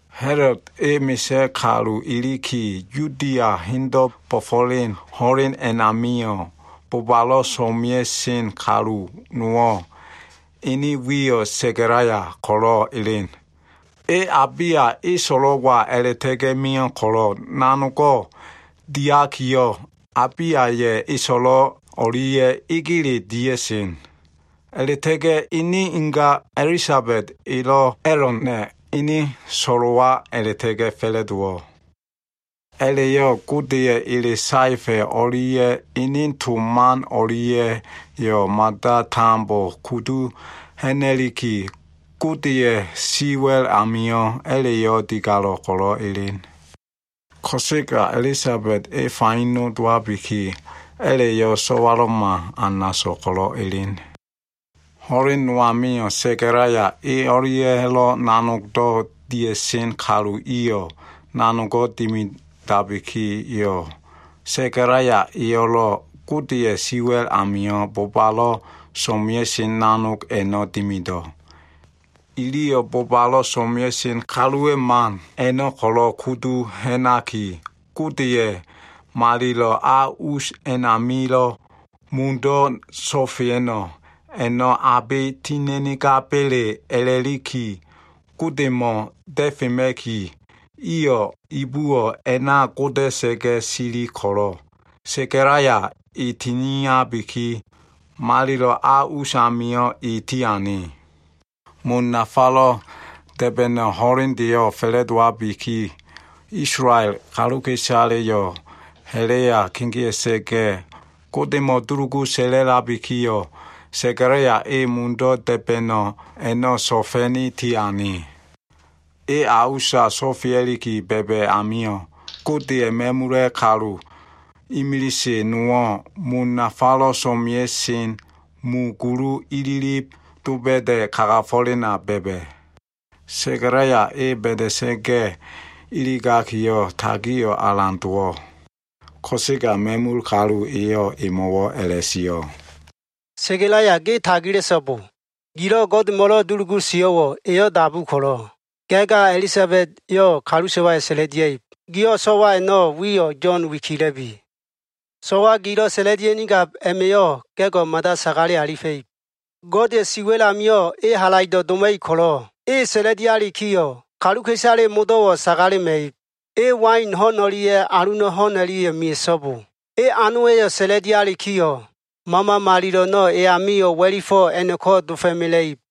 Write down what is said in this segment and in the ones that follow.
Ha꞉lod e misa꞉ kalu iliki, Yudia hendo꞉ bo꞉fo꞉len ho꞉len a꞉namio꞉, bobalo꞉ so꞉mea꞉sen kalu nowo꞉, ene wiyo꞉ Sekalaya ko꞉lo꞉ elen. E Abiyaya꞉ eso꞉lo꞉wa a꞉la꞉ta꞉ga꞉ mio꞉ ko꞉lo꞉, nanogo꞉ diakiyo꞉, Abiyaya꞉ eso꞉lo꞉ o꞉lia꞉ egele dia꞉sen. A꞉la꞉ta꞉ga꞉ ene inga Elisabed elo꞉ A꞉lona꞉ ene so꞉lo꞉wa a꞉la꞉ta꞉ga꞉ fa꞉la꞉dowo꞉. A꞉la꞉yo꞉ Godeya꞉ ele saefa꞉ o꞉lia꞉ ene to man o꞉lia꞉yo꞉ mada tambo kudu ha꞉na꞉liki, Godeya꞉ si wa꞉l amio꞉ a꞉la꞉yo꞉ digalo꞉ ko꞉lo꞉ elen. Ko꞉sega Elisabed e faino dowabiki, a꞉la꞉yo꞉ so꞉walo꞉ma, anaso꞉ ko꞉lo꞉ elen. Ho꞉len no amio꞉ Sekalaya e o꞉lia꞉lo꞉ nanogdo꞉ dia꞉sen kalu iyo꞉ nanogo꞉ dimidabikiyo꞉, Sekalaya eyo꞉lo꞉ Godeya꞉ siwa꞉l amio꞉ bobalo꞉ so꞉mea꞉sen nanog a꞉no꞉ dimido꞉. Iliyo꞉ bobalo꞉ so꞉mea꞉sen kaluwa꞉ man a꞉no꞉ ko꞉lo꞉ kudu ha꞉naki, Godeya꞉ malilo꞉ a us a꞉namilo꞉ mundo꞉ so꞉fea꞉no꞉ a꞉no꞉ abe tina꞉nigaba꞉le a꞉la꞉liki, Godemo꞉ da꞉fema꞉ki, iyo꞉ ibuwo꞉ a꞉na goda꞉sa꞉ga꞉ sili ko꞉lo꞉, Sekalaya e tiniabiki, malilo꞉ a usamio꞉ e tiane. Mun nafalo꞉ da꞉ba꞉no꞉ ho꞉lendeyo꞉ fa꞉la꞉dowabiki, Isolael kaluka꞉isaleyo꞉ ha꞉la꞉ya kegea꞉sa꞉ga꞉, Godemo꞉ dulugu sa꞉la꞉labikiyo꞉, Sekalaya e mundo꞉ da꞉ba꞉no꞉ a꞉no꞉ so꞉fa꞉ni tiane. E a usa sofea꞉liki ba꞉ba꞉ amio꞉, Godeya꞉ ma꞉mula꞉ kalu imilise nowo꞉, mun nafalo꞉ so꞉mea꞉sen mu gulu ililib doba꞉da꞉ kagafo꞉lena ba꞉ba꞉. Sekalaya e ba꞉da꞉sa꞉ga꞉ iligakiyo꞉, tagio꞉ alan dowo꞉ Ko꞉sega ma꞉mul kalu eyo꞉ emo꞉wo꞉ a꞉la꞉sio꞉, “Sekalaya, ge tagila꞉so꞉bo! Gilo꞉ Godemo꞉lo꞉ dulugu sio꞉wo꞉ Eyo꞉ dabu ko꞉lo꞉, ga꞉ ga Elisabed eyo꞉ kalu so꞉wayo꞉ sa꞉la꞉lia꞉ib. Giyo꞉ so꞉wa a꞉no꞉ wiyo꞉ Yo꞉n wikila꞉bi. So꞉wa gilo꞉ sa꞉la꞉lia꞉nigab a꞉ma꞉yo꞉, ga꞉go꞉ mada sagale alifa꞉ib. Godeya꞉ si wa꞉l amio꞉ e halaido꞉ doma꞉ib ko꞉lo꞉, e sa꞉la꞉lialikiyo꞉, kaluka꞉isale modo꞉wo꞉ sagalema꞉ib. E wain ho꞉n o꞉lia꞉ aluna꞉ ho꞉n o꞉lia꞉yo꞉ mea꞉so꞉bo. E anowa꞉yo꞉ sa꞉la꞉lialikiyo꞉, Mama Malilo꞉ a꞉no꞉ e amio꞉ wa꞉lifo꞉ a꞉no꞉ko꞉ dofo꞉mela꞉ib.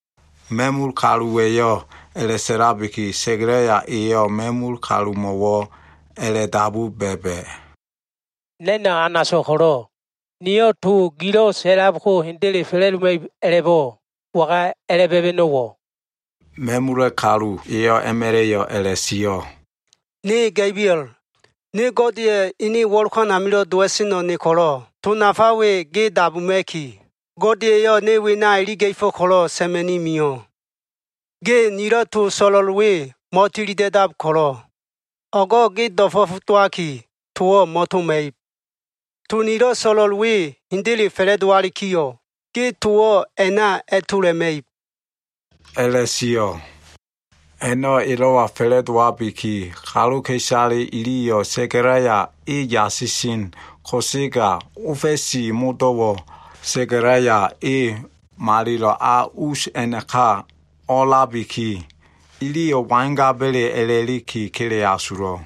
Ma꞉mul kaluwa꞉yo꞉ a꞉la꞉sa꞉labiki, Sekalaya eyo꞉ ma꞉mul kalumo꞉wo꞉ a꞉la꞉dabu ba꞉ba꞉, “Na꞉no꞉ anaso꞉ ko꞉lo꞉ niyo꞉ to gilo꞉ sa꞉lab ko hendele fa꞉la꞉doma꞉ib a꞉la꞉bo꞉, waga a꞉la꞉ ba꞉ba꞉no꞉wo꞉?” Ma꞉mul kalu eyo꞉ a꞉ma꞉la꞉yo꞉ a꞉la꞉sio꞉, “Ne Ga꞉biol. Ne Godeya꞉ ene wo꞉lokan amilo꞉ dowa꞉seno꞉ ne ko꞉lo꞉, to nafa we ge dabuma꞉ki, Gode eyo꞉ ne wena iliga꞉fo꞉ ko꞉lo꞉ sa꞉ma꞉ni mio꞉. Ge nilo꞉ to so꞉lo꞉l we mo꞉tilida꞉dab ko꞉lo꞉, o꞉go꞉ ge do꞉fo꞉f dowaki, towo꞉ mo꞉toma꞉ib. To nilo꞉ so꞉lo꞉l we hendele fa꞉la꞉dowalikiyo꞉, ge towo꞉ a꞉na a꞉tola꞉ma꞉ib” a꞉la꞉sio꞉. A꞉no꞉ elo꞉wa fa꞉la꞉dowabiki, kaluka꞉isale iliyo꞉ Sekalaya e yasisen ko꞉sega, ofa꞉si modo꞉wo꞉ Sekalaya e malilo꞉ a us a꞉naka o꞉a꞉labiki, iliyo꞉ wangaba꞉le a꞉la꞉liki kele asulo꞉.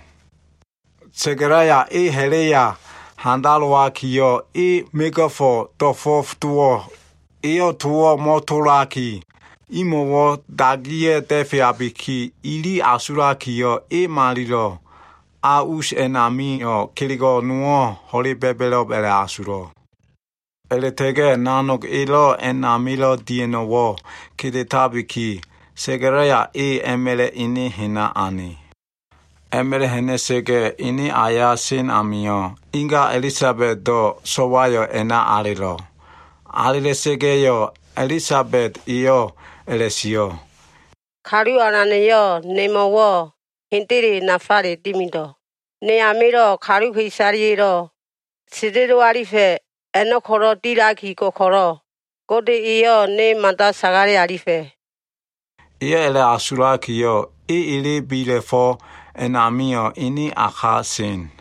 Sekalaya e ha꞉la꞉ya handalowakiyo꞉, e mego꞉fo꞉ do꞉fo꞉f dowo꞉. Eyo꞉ towo꞉ mo꞉tolaki, imo꞉wo꞉ dagiya꞉ da꞉feabiki, ili asulakiyo꞉, e malilo꞉ a us a꞉namio꞉ kelego꞉ nowo꞉ ho꞉le ba꞉ba꞉lo꞉b a꞉la꞉asulo꞉. A꞉la꞉ta꞉ga꞉ nanog elo꞉ a꞉namilo꞉ dia꞉no꞉wo꞉ kedetabiki, Sekalaya e a꞉ma꞉la꞉ ene hena ane. A꞉ma꞉la꞉ ha꞉na꞉sa꞉ga꞉, ene aya sen amio꞉, inga Elisabedo꞉ so꞉wayo꞉ a꞉na alelo꞉. Alela꞉sa꞉ga꞉yo꞉, Elisabed eyo꞉ a꞉la꞉sio꞉, “Kalu Alana꞉yo꞉ hendele nemo꞉wo꞉ nafale dimido꞉. Ne amilo꞉ kaluka꞉isaleya꞉lo꞉ sendelo alifa꞉ a꞉no꞉ ko꞉lo꞉ dilaki go꞉ ko꞉lo꞉, Gode eyo꞉ ne mada sagale alifa꞉.” Eyo꞉ a꞉la꞉asulakiyo꞉, e ele bila꞉fo꞉ a꞉namio꞉ ene a ka sen.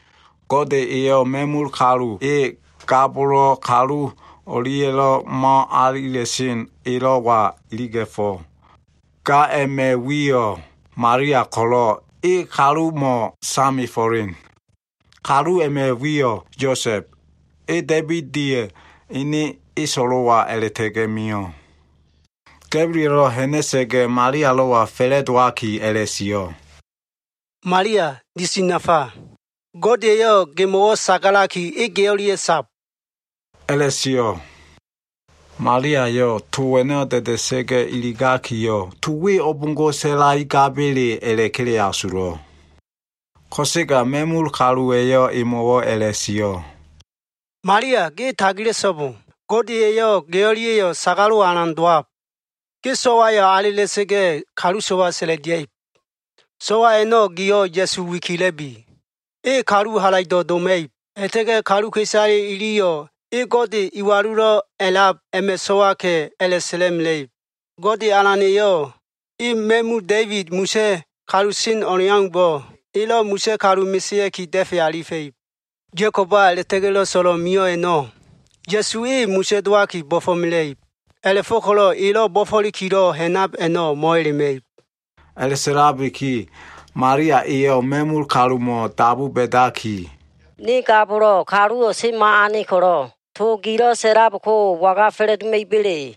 Gode eyo꞉ ma꞉mul kalu e, ga bolo꞉ kalu o꞉lia꞉lo꞉ mo꞉alila꞉sen elo꞉wa iliga꞉fo꞉. Ga a꞉ma꞉ wiyo꞉ Malia ko꞉lo꞉ e kalumo꞉ samefo꞉len. Kalu a꞉ma꞉ wiyo꞉ Yosa꞉b. E Da꞉ibida꞉ ene eso꞉lo꞉wa a꞉la꞉ta꞉ga꞉ mio꞉. Ga꞉biolo꞉ ha꞉na꞉sa꞉ga꞉, Malialo꞉wa fa꞉la꞉dowaki a꞉la꞉sio꞉ “Malia, disi nafa. Gode eyo꞉ gemo꞉wo꞉ sagalaki, e ge o꞉lia꞉ sab” a꞉la꞉sio꞉. Maliayo꞉ to a꞉no꞉ da꞉da꞉sa꞉ga꞉ iligakiyo꞉, to we o꞉bo꞉ngo꞉ sa꞉laigabele a꞉la꞉kele asulo꞉. Ko꞉sega ma꞉mul kaluwa꞉yo꞉ emo꞉wo꞉ a꞉la꞉sio꞉ “Malia, ge tagila꞉so꞉bo. Gode eyo꞉ ge o꞉lia꞉yo꞉ sagalo꞉wo꞉ alan dowab. Ge so꞉wayo꞉ alela꞉sa꞉ga꞉, kalu so꞉wa sa꞉la꞉lia꞉ib. So꞉wa a꞉no꞉ giyo꞉ Ya꞉su wikila꞉bi. E kalu halaido꞉ doma꞉ib, a꞉la꞉ta꞉ga꞉ kaluka꞉isale iliyo꞉ e Gode Iwalulo꞉ A꞉lab a꞉ma꞉ so꞉waka꞉, a꞉la꞉sa꞉la꞉mela꞉ib. Gode Alan eyo꞉, e ma꞉mu Da꞉ibid misa꞉ kalu sen o꞉leaumbo꞉, elo꞉ misa꞉ kalu mesea꞉ki, da꞉fe alifa꞉ib. Ya꞉koba a꞉la꞉ta꞉ga꞉lo꞉ so꞉lo꞉ mio꞉ a꞉no꞉, Ya꞉su E misa꞉ dowaki bo꞉fo꞉mela꞉ib. A꞉la꞉fo꞉ko꞉lo꞉ elo꞉ bo꞉fo꞉likilo꞉ ha꞉nab a꞉no꞉ mo꞉elema꞉ib.” A꞉la꞉sa꞉labiki, Malia eyo꞉ ma꞉mul kalumo꞉ dabu ba꞉daki, “Ne ga bolo꞉, kaluwo꞉ o꞉semo꞉ ane ko꞉lo꞉, to gilo꞉ sa꞉lab ko waga fa꞉la꞉doma꞉iba꞉le?”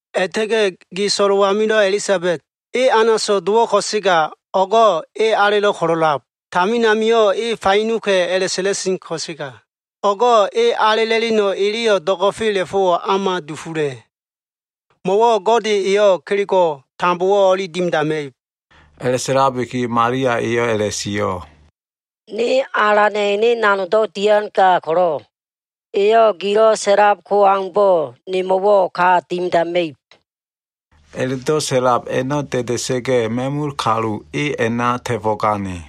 A꞉la꞉ta꞉ga꞉ ge so꞉lo꞉ amilo꞉ Elisabed, e anaso꞉ dowo꞉ ko꞉sega, o꞉go꞉ e alelo꞉ ko꞉lo꞉ sab. Tamin amio꞉ e fainoka꞉ a꞉la꞉sa꞉la꞉sen ko꞉sega, o꞉go꞉ e alela꞉leno꞉ eleyo꞉ do꞉go꞉fela꞉fo꞉wo꞉ o꞉ma dufula꞉. Mo꞉wo꞉ Gode eyo꞉ kelego꞉ tambowo꞉ o꞉li dimidama꞉ib.” A꞉la꞉sa꞉labiki, Malia eyo꞉ a꞉la꞉sio꞉, “Ne Alana꞉ ene nanogdo꞉ dian ga ko꞉lo꞉, eyo꞉ gilo꞉ sa꞉lab ko aumbo꞉ nemo꞉wo꞉ ka dimidama꞉ib.” A꞉la꞉do꞉ sa꞉lab a꞉no꞉ da꞉da꞉sa꞉ga꞉, ma꞉mul kalu e a꞉na ta꞉fo꞉gane.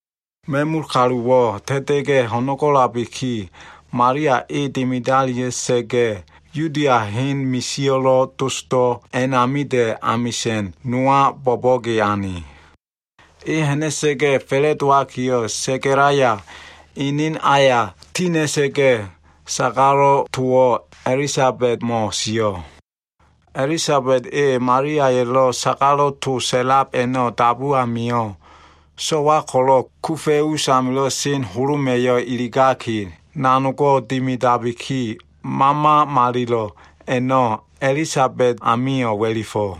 Ma꞉mul kaluwo꞉ ta꞉ta꞉ga꞉ ho꞉no꞉go꞉labiki, Malia e dimidalia꞉sa꞉ga꞉, Yuda hen misio꞉lo꞉ dosdo꞉ a꞉namida꞉ amisa꞉n nowa bo꞉bo꞉ge ane. E ha꞉na꞉sa꞉ga꞉ fa꞉la꞉dowakiyo꞉, Sekalaya ene aya tina꞉sa꞉ga꞉, sagalo꞉ towo꞉ Elisabedmo꞉ sio꞉. Elisabed e Maliaya꞉lo꞉ sagalo꞉ to sa꞉lab a꞉no꞉ dabu amio꞉, so꞉wa ko꞉lo꞉ kufa꞉ usamilo꞉ sen holoma꞉yo꞉ iligaki nanogo꞉ dimidabiki, Mama Malilo꞉ a꞉no꞉ Elisabed amio꞉ wa꞉lifo꞉.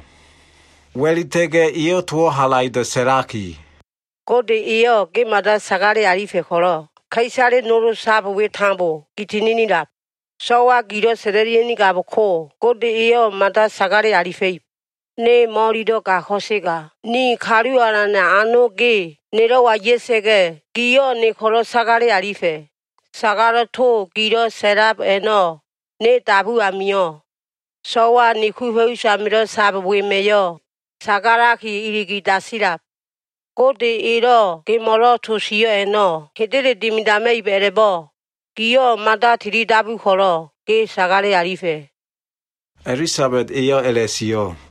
Wa꞉lita꞉ga꞉, eyo꞉ towo꞉ halaido꞉ sa꞉laki, “Gode eyo꞉ ge mada sagale alifa꞉ ko꞉lo꞉ ka꞉isale nol sab we tambo, gi tininilab. So꞉wa gilo꞉ sa꞉la꞉lia꞉nigab ko, Gode eyo꞉ mada sagale alifa꞉ib. Ne mo꞉ililo꞉ ga ko꞉sega ni Kalu Alana꞉ ano ge nelo꞉wa ya꞉sa꞉ga꞉, giyo꞉ ne ko꞉lo꞉ sagale alifa꞉. Sagalo꞉ to gilo꞉ sa꞉lab a꞉no꞉ ne dabu amio꞉, so꞉wa ni kufa꞉ usamilo꞉ sab wema꞉yo꞉ sagalaki iligi dasilab. Gode Elo꞉ gemo꞉lo꞉ to sio꞉ a꞉no꞉ hendele dimidama꞉ib a꞉la꞉bo꞉, giyo꞉ mada tilidabu ko꞉lo꞉, ge sagale alifa꞉.” Elisabed eyo꞉ a꞉la꞉sio꞉.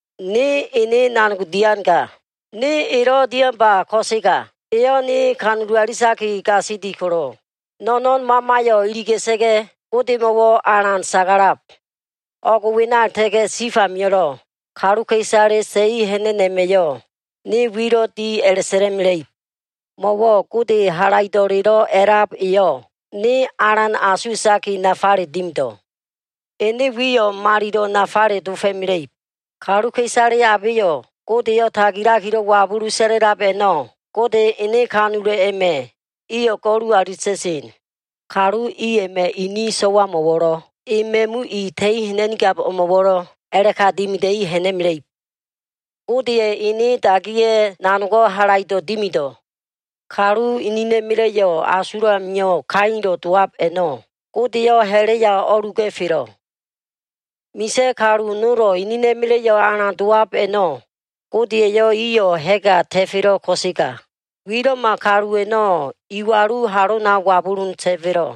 Ne ene nanog dian ga. Ne elo꞉ dianba, ko꞉sega Eyo꞉ ne kanulu alitaki gasili ko꞉lo꞉, No꞉no꞉n mamayo꞉ iliga꞉sa꞉ga꞉, Godemo꞉wo꞉ alan sagalab. O꞉g wena a꞉la꞉ta꞉ga꞉ tif amio꞉lo꞉, kaluka꞉isale ta꞉i ha꞉na꞉no꞉ a꞉ma꞉yo꞉ ne wilo꞉ di a꞉la꞉sa꞉la꞉mela꞉ib. Mo꞉wo꞉ Gode Halaido꞉lelo꞉ A꞉lab eyo꞉ ne alan asuwa꞉taki nafale dimido꞉. Ene wiyo꞉ malilo꞉ nafale dofo꞉mela꞉ib. Kaluka꞉isale abeyo꞉ Godeyo꞉ tagilakilo꞉ wabulu sa꞉la꞉lab a꞉no꞉, Godeya꞉ ene kanulo꞉ a꞉ma꞉ iyo꞉ go꞉lu alita꞉sen. Kalu i a꞉ma꞉ ini so꞉wamo꞉wo꞉lo꞉, i ma꞉mu i ta꞉i ha꞉na꞉nigab o꞉mo꞉wo꞉lo꞉ a꞉la꞉ka dimida꞉i ha꞉na꞉mela꞉ib. Gode ene dagiya꞉ nanog halaido꞉ dimido꞉. Kalu inina꞉ma꞉la꞉yo꞉ asulo꞉ amio꞉ kailo꞉ dowab a꞉no꞉, Gode eyo꞉ ha꞉la꞉ya o꞉luga꞉felo꞉. Misa꞉ kalu nolo꞉ enena꞉ma꞉la꞉yo꞉ alan dowab a꞉no꞉, Gode eyo꞉ iyo꞉ ha꞉ga ta꞉felo꞉ ko꞉sega, wilo꞉ma kalu a꞉no꞉ iwalu halona wabulun ta꞉felo꞉.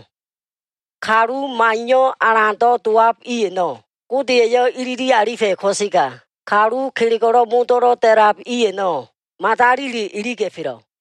Kalu maiyo꞉ alando꞉ a꞉lab i a꞉no꞉, Gode eyo꞉ ilili alifa꞉ ko꞉sega, kalu kelego꞉wo꞉ modo꞉lo꞉ da꞉lab i a꞉no꞉, madalile iliga꞉felo꞉.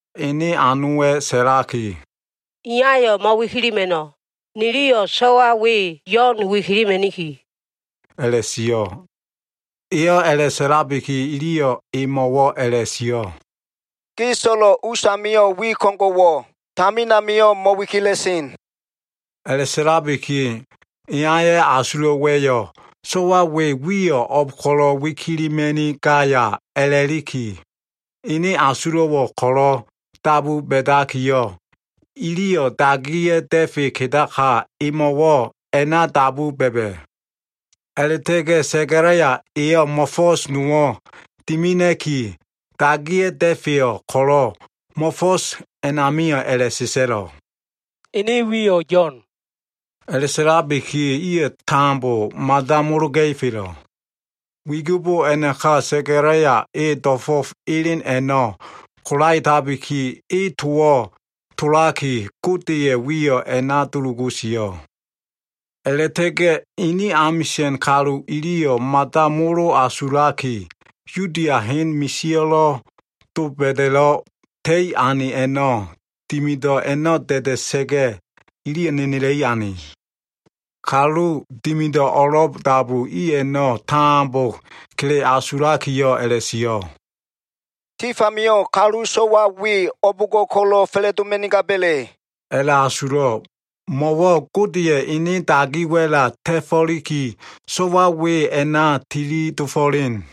ene anowa꞉ sa꞉laki, “Iyayo꞉ mo꞉wikilima꞉no. Niliyo꞉ so꞉wa we, Yo꞉n wikilima꞉niki” a꞉la꞉sio꞉. Eyo꞉ a꞉la꞉sa꞉labiki, iliyo꞉ emo꞉wo꞉ a꞉la꞉sio꞉, “Ge so꞉lo꞉ us amio꞉ wi ko꞉ngo꞉wo꞉ tamin amio꞉ mo꞉wikila꞉sen.” A꞉la꞉sa꞉labiki, iyaya꞉ asulo꞉wa꞉yo꞉ so꞉wa we wiyo꞉ o꞉b ko꞉lo꞉ wikilima꞉nigaya a꞉la꞉liki, ene asulo꞉wo꞉ ko꞉lo꞉ dabu ba꞉dakiyo꞉, iliyo꞉ dagiya꞉ da꞉fe kedaka emo꞉wo꞉ a꞉na dabu ba꞉ba꞉. A꞉la꞉ta꞉ga꞉ Sekalaya eyo꞉ mo꞉fo꞉s nowo꞉ dimina꞉ki, dagiya꞉ da꞉feyo꞉ ko꞉lo꞉, mo꞉fo꞉s a꞉namio꞉ a꞉la꞉sa꞉sa꞉lo꞉ “Ene wiyo꞉ Yo꞉n.” A꞉la꞉sa꞉sa꞉labiki, iyo꞉ tambo mada mologa꞉ifelo꞉. Wigibo a꞉naka Sekalaya e do꞉fo꞉f elen a꞉no꞉ kolaetabiki, e towo꞉ tolaki, Godeya꞉ wiyo꞉ a꞉na dulugu sio꞉. A꞉la꞉ta꞉ga꞉ ene amisa꞉n kalu iliyo꞉ mada molo asulaki, Yudia hen misio꞉lo꞉ doba꞉da꞉lo꞉ ta꞉i ane a꞉no꞉ dimido꞉ a꞉no꞉ da꞉da꞉sa꞉ga꞉yo꞉, iliyo꞉ nenela꞉i ane. Kalu dimido꞉ o꞉lo꞉ dabu i a꞉no꞉ tambo kele asulakiyo꞉ a꞉la꞉sio꞉, “Tif amio꞉ kalu so꞉wa we o꞉bo꞉ngo꞉ ko꞉lo꞉ fa꞉la꞉doma꞉nigaba꞉le?” a꞉la꞉asulo꞉. Mo꞉wo꞉ Godeya꞉ ene dagi wa꞉la ta꞉fo꞉liki, so꞉wa we a꞉na tili dofo꞉len.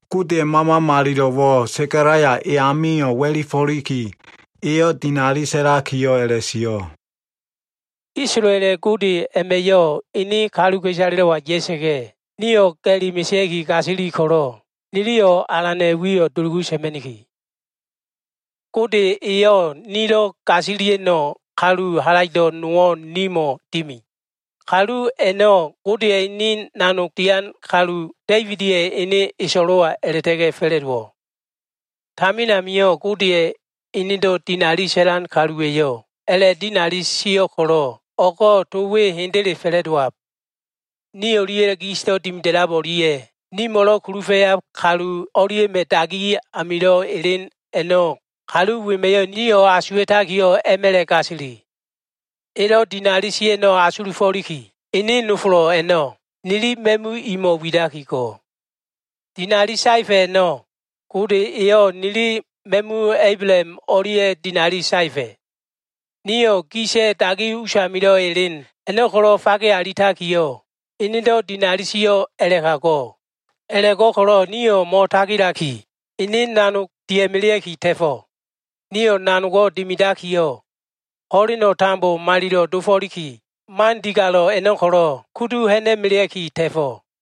Godeya꞉ Mama Malilo꞉wo꞉ Sekalaya e amio꞉ wa꞉lifo꞉liki, eyo꞉ dinali sa꞉lakiyo꞉ a꞉la꞉sio꞉. “Isolaela꞉ Gode a꞉ma꞉yo꞉ ene kaluka꞉isalelo꞉wa ya꞉sa꞉ga꞉, niyo꞉ ga꞉li mesea꞉ki gasili ko꞉lo꞉, niliyo꞉ Alana꞉ wiyo꞉ dulugu sa꞉ma꞉niki. Gode eyo꞉ nilo꞉ gasilia꞉no꞉ kalu halaido꞉ nowo꞉ nimo꞉ dimi. Kalu a꞉no꞉ Godeya꞉ ene nanog dian kalu Da꞉ibida꞉ ene eso꞉lo꞉wa a꞉la꞉ta꞉ga꞉ fa꞉la꞉dowo꞉. Tamina Gode enedo꞉ dinali sa꞉lan kaluwa꞉yo꞉ a꞉la꞉dinali sio꞉ ko꞉lo꞉, o꞉go꞉ to we hendele fa꞉la꞉dowo꞉. Ni o꞉lia꞉lo꞉ gisdo꞉ dimida꞉lab o꞉lia꞉ nimo꞉lo꞉ kulufa꞉yab kalu o꞉lia꞉ma꞉ dagi amilo꞉ elen a꞉no꞉ kalu wema꞉yo꞉ nio꞉ ko꞉lo꞉ asuwa꞉taki, a꞉ma꞉la꞉ gasili. Elo꞉ dinali sio꞉ a꞉no꞉ asulufo꞉liki, ene nofolo꞉ a꞉no꞉ nili ma꞉mu imo꞉ widaki go꞉. Dinali saefa꞉ a꞉no꞉, Gode eyo꞉ nili ma꞉mu Ablaham o꞉lia꞉ dinali saefa꞉. Nio꞉ gisa꞉ dagi usamilo꞉ elen a꞉no꞉ ko꞉lo꞉ fage alitakiyo꞉, enedo꞉ dinali sio꞉ a꞉la꞉ka go꞉. A꞉la꞉go꞉ko꞉lo꞉ nio꞉ mo꞉tagilaki, ene nanog dia꞉melea꞉ki ta꞉fo꞉. Nio꞉ nanogo꞉ dimidakiyo꞉, ho꞉leno꞉ tambo malilo꞉ dofo꞉liki, man digalo꞉ a꞉no꞉ ko꞉lo꞉ kudu ha꞉na꞉melea꞉ki ta꞉fo꞉.”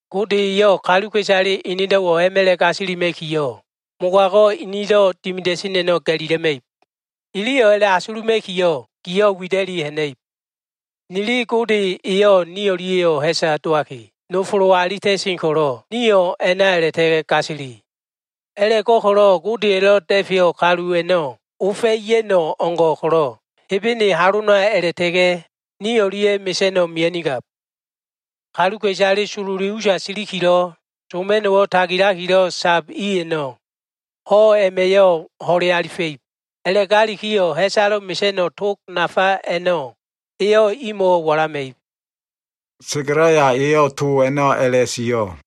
Gode eyo꞉ kaluka꞉isale enedo꞉wo꞉ a꞉ma꞉la꞉ gasilima꞉kiyo꞉, mogago꞉ inido꞉ dimida꞉sen a꞉no꞉ ga꞉lila꞉ma꞉ib. Iliyo꞉ a꞉la꞉asuluma꞉kiyo꞉, giyo꞉ wida꞉liki ha꞉na꞉ib. Nili Gode eyo꞉ ni o꞉lia꞉yo꞉ ha꞉sa dowaki, nofolo alita꞉sen ko꞉lo꞉, nio꞉ a꞉na a꞉la꞉ta꞉ga꞉ gasili. A꞉la꞉go꞉ko꞉lo꞉ Godeya꞉lo꞉ Da꞉feyo꞉ kalu a꞉no꞉ ofa꞉ ya꞉no꞉ o꞉ngo꞉ ko꞉lo꞉ Hebene halona a꞉la꞉ta꞉ga꞉ ni o꞉lia꞉ mesa꞉no꞉ mia꞉nigab. Kaluka꞉isale sololi usa siliki, soma꞉no꞉wo꞉ tagilakilo꞉ sab i a꞉no꞉, ho꞉ a꞉ma꞉yo꞉ ho꞉le alifa꞉ib. A꞉la꞉gakiyo꞉ ha꞉salo꞉ mesa꞉no꞉ tog nafa a꞉no꞉ eyo꞉ imo꞉wo꞉ walama꞉ib.” Sekalaya eyo꞉ to a꞉no꞉ a꞉la꞉sio꞉.